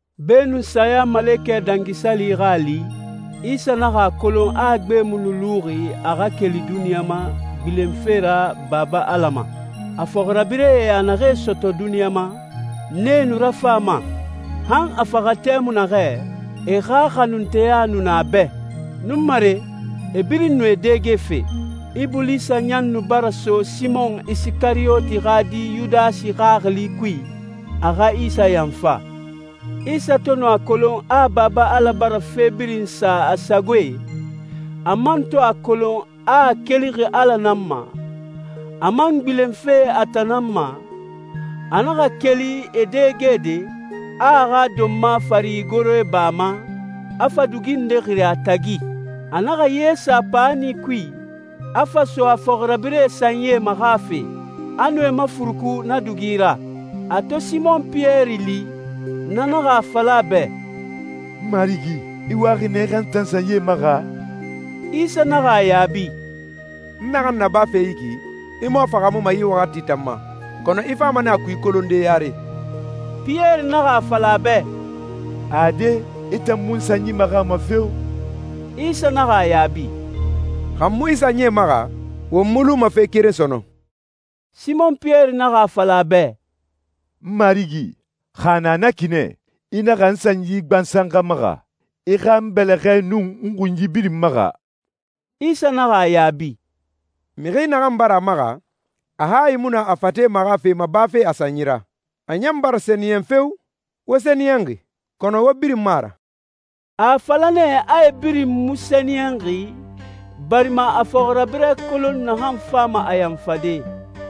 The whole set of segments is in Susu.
Beenun Sayamalekɛ Dangi Sali xa a li, Isa naxa a kolon a gbe mu nu luxi a xa keli duniɲa ma gbilenfe ra Baba Ala ma. A fɔxirabirɛe a naxee sɔtɔ duniɲa ma, nee nu rafan a ma. Han a faxa tɛmui naxɛ, e xa xanunteya nu na a bɛ. Nunmare, e birin nu e dɛgefe. Ibulisa ɲan nu bara so Simɔn Isikariyoti xa di Yudasi xaxili kui, a xa Isa yanfa. Isa to nu a kolon a Baba Ala bara fe birin sa a sagoe, a man to a kolon a a kelixi Ala nan ma, a man gbilenfe a tan nan ma, a naxa keli e dɛgede, a a xa donma fari igoroe ba a ma, a fa dugi nde xiri a tagi. A naxa ye sa paani kui, a fa so a fɔxirabirɛe sanyie maxafe, a nu e mafuruku na dugi ra. A to Simɔn Piyɛri li, na naxa a fala a bɛ, «Marigi, i waxi nɛ i xa n tan sanyie maxa?» Isa naxa a yaabi, «N naxan nabafe yi ki, i mu a fahaamuma yi waxati tan ma, kɔnɔ i fama nɛ a kui kolonde yare.» Piyɛri naxa a fala a bɛ, «Ade, i tan mu n sanyi maxama feo!» Isa naxa a yaabi, «Xa n mu i sanyie maxa, won mu luma fe keren sɔnɔn.» Simɔn Piyɛri naxa a fala a bɛ, «N Marigi, xa a na na ki nɛ, i naxa n sanyi gbansan xa maxa. I xa n bɛlɛxɛe nun n xunyi birin maxa.» Isa naxa a yaabi, «Mixi naxan bara a maxa, a hayi mu na a fate maxafe ma bafe a sanyi ra. A ɲan bara sɛniyɛn feo! Wo sɛniyɛnxi, kɔnɔ wo birin mu a ra.» A a fala nɛ a e birin mu sɛniyɛnxi, barima a a fɔxirabirɛ kolon naxan fama a yanfade.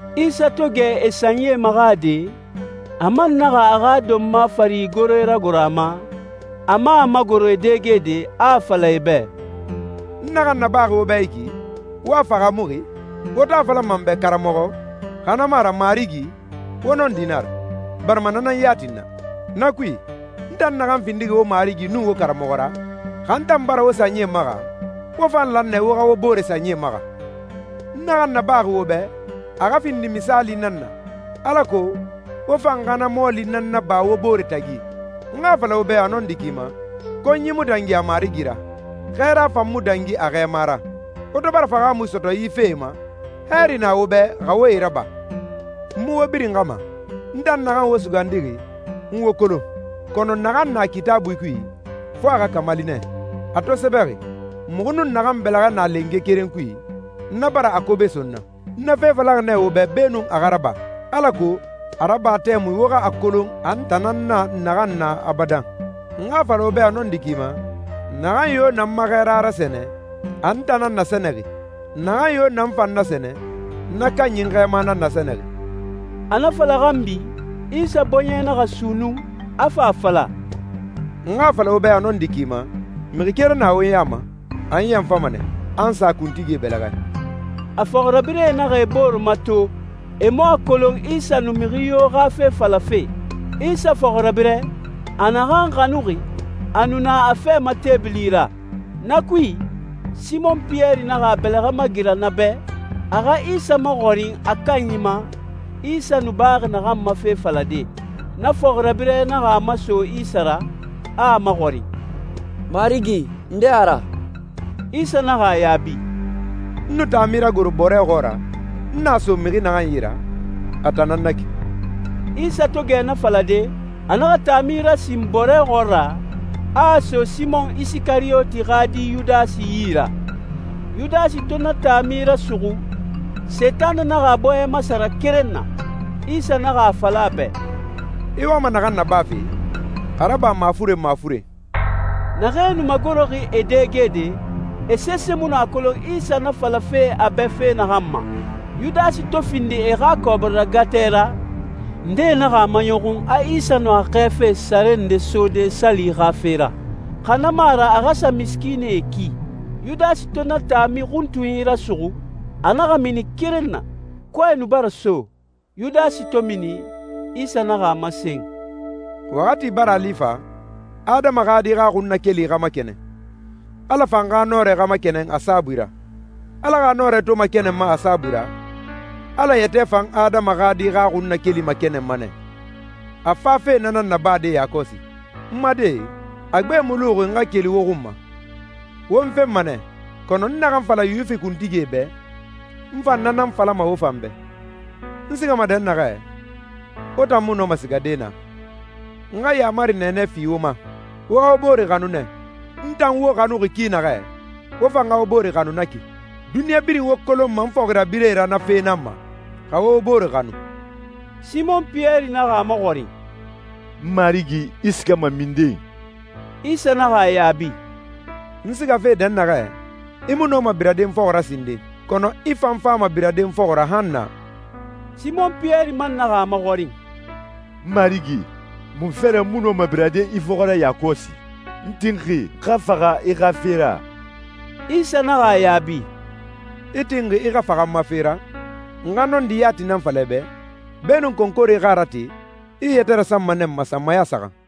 Isa to gɛ e sanyie maxade, a man naxa a xa donma fari igoroe ragoro a ma, a man a magoro e dɛgede, a a fala e bɛ, «N naxan nabaxi wo bɛ yi ki, wo a fahaamuxi? Wo to a falama n bɛ ‹Karamɔxɔ›, xa na mu a ra ‹Marigi›, wo nɔndi nan a ra, barima na nan yati n na. Na kui, n tan naxan findixi wo Marigi nun wo Karamɔxɔ ra, xa n tan bara wo sanyie maxa, wo fan lan nɛ wo xa wo bore sanyie maxa. N naxan nabaxi wo bɛ, a xa findi misaali nan na, alako wo fan xa na mɔɔli nan naba wo bore tagi. N xa a fala wo bɛ a nɔndi ki ma, konyi mu dangi a marigi ra, xɛɛra fan mu dangi a xɛɛma ra. Wo to bara fahaamui sɔtɔ yi fee ma, hɛɛri na wo bɛ xa wo e raba.» «N mu wo birin xa ma. N tan naxan wo sugandixi, n wo kolon. Kɔnɔ naxan na Kitaabui kui, fo a xa kamali nɛ, a to sɛbɛxi, ‹Muxu nun naxan bɛlɛxɛ na lenge keren kui, na bara a kobe so n na.› N na fe falaxi nɛ wo bɛ beenun a xa raba, alako a raba tɛmui wo xa a kolon a n tan nan na naxan na abadan. N xa a fala wo bɛ a nɔndi ki ma, naxan yo na n ma xɛɛra rasɛnɛ, a n tan nan nasɛnɛxi. Naxan yo na n fan nasɛnɛ, na kanyi n Xɛɛma nan nasɛnɛxi.» A na fala xanbi, Isa bɔɲɛ naxa sunnun, a fa a fala, «N xa a fala wo bɛ a nɔndi ki ma, mixi keren na wo ya ma, a n yanfama nɛ, a n sa kuntigie bɛlɛxɛ.» A fɔxirabirɛe naxa e bore mato, e mu a kolon Isa nu mixi yo xa fe falafe. Isa fɔxirabirɛ, a naxan xanuxi, a nu na a fɛ ma teebili ra. Na kui, Simɔn Piyɛri naxa a bɛlɛxɛ magira na bɛ, a xa Isa maxɔrin a kanyi ma, Isa nu baxi naxan ma fe falade. Na fɔxirabirɛ naxa a maso Isa ra, a a maxɔrin, «Marigi, nde a ra?» Isa naxa a yaabi, «N nu taami ragoro bɔrɛ xɔɔra, n a so mixi naxan yi ra, a tan nan na ki.» Isa to gɛ na falade, a naxa taami rasin bɔrɛ xɔɔra, a a so Simɔn Isikariyoti xa di Yudasi yi ra. Yudasi to na taami rasuxu, Sentanɛ naxa a bɔɲɛ masara keren na. Isa naxa a fala a bɛ, «I wama naxan nabafe, a raba mafuren mafuren.» Naxee nu magoroxi e dɛgede, e sese mu a kolon Isa na falafe a bɛ fe naxan ma. Yudasi to findi e xa kɔbiri ragatɛ ra, ndee naxa a maɲɔxun a Isa nu a xɛɛfe sare nde sode sali xa fe ra, xa na mu a ra a xa sa misikiinɛe ki. Yudasi to na taami xuntunyi rasuxu, a naxa mini keren na. Kɔɛ nu bara so. Yudasi to mini, Isa naxa a masen, «Waxati bara a li fa, Adama xa Di xa xunnakeli xa makɛnɛn, Ala fan xa nɔrɛ xa makɛnɛn a saabui ra. Ala xa nɔrɛ to makɛnɛnma a saabui ra, Ala yɛtɛ fan Adama xa Di xa xunnakeli makɛnɛnma nɛ. A fafe na nan nabade yakɔsi. N ma die, a gbe mu luxi n xa keli wo xun ma. Wo n fenma nɛ, kɔnɔ n naxan fala Yuwifi kuntigie bɛ, n fa na nan falama wo fan bɛ, ‹N sigama dɛnnaxɛ, wo tan mu nɔma sigade naa.›» «N xa yaamari nɛɛnɛ fi wo ma: Wo xa wo bore xanu nɛ. N tan wo xanuxi ki naxɛ, wo fan xa wo bore xanu na ki. Duniɲa birin wo kolonma n fɔxirabirɛe ra na fe nan ma, xa wo wo bore xanu.» Simɔn Piyɛri naxa a maxɔrin, «Marigi, i sigama minden?» Isa naxa a yaabi, «N sigafe dɛnnaxɛ, i mu nɔma birade n fɔxɔ ra sinden, kɔnɔ i fan fama birade n fɔxɔ ra han naa.» Simɔn Piyɛri man naxa a maxɔrin, «Marigi, munfe ra n mu nɔma birade i fɔxɔ ra yakɔsi? N tinxi n xa faxa i xa fe ra!» Isa naxa a yaabi, «I tinxi i xa faxa n ma fe ra? N xa nɔndi yati nan fala i bɛ, beenun konkore xa a rate, i i yɛtɛ rasanma nɛ n ma sanmaya saxan.»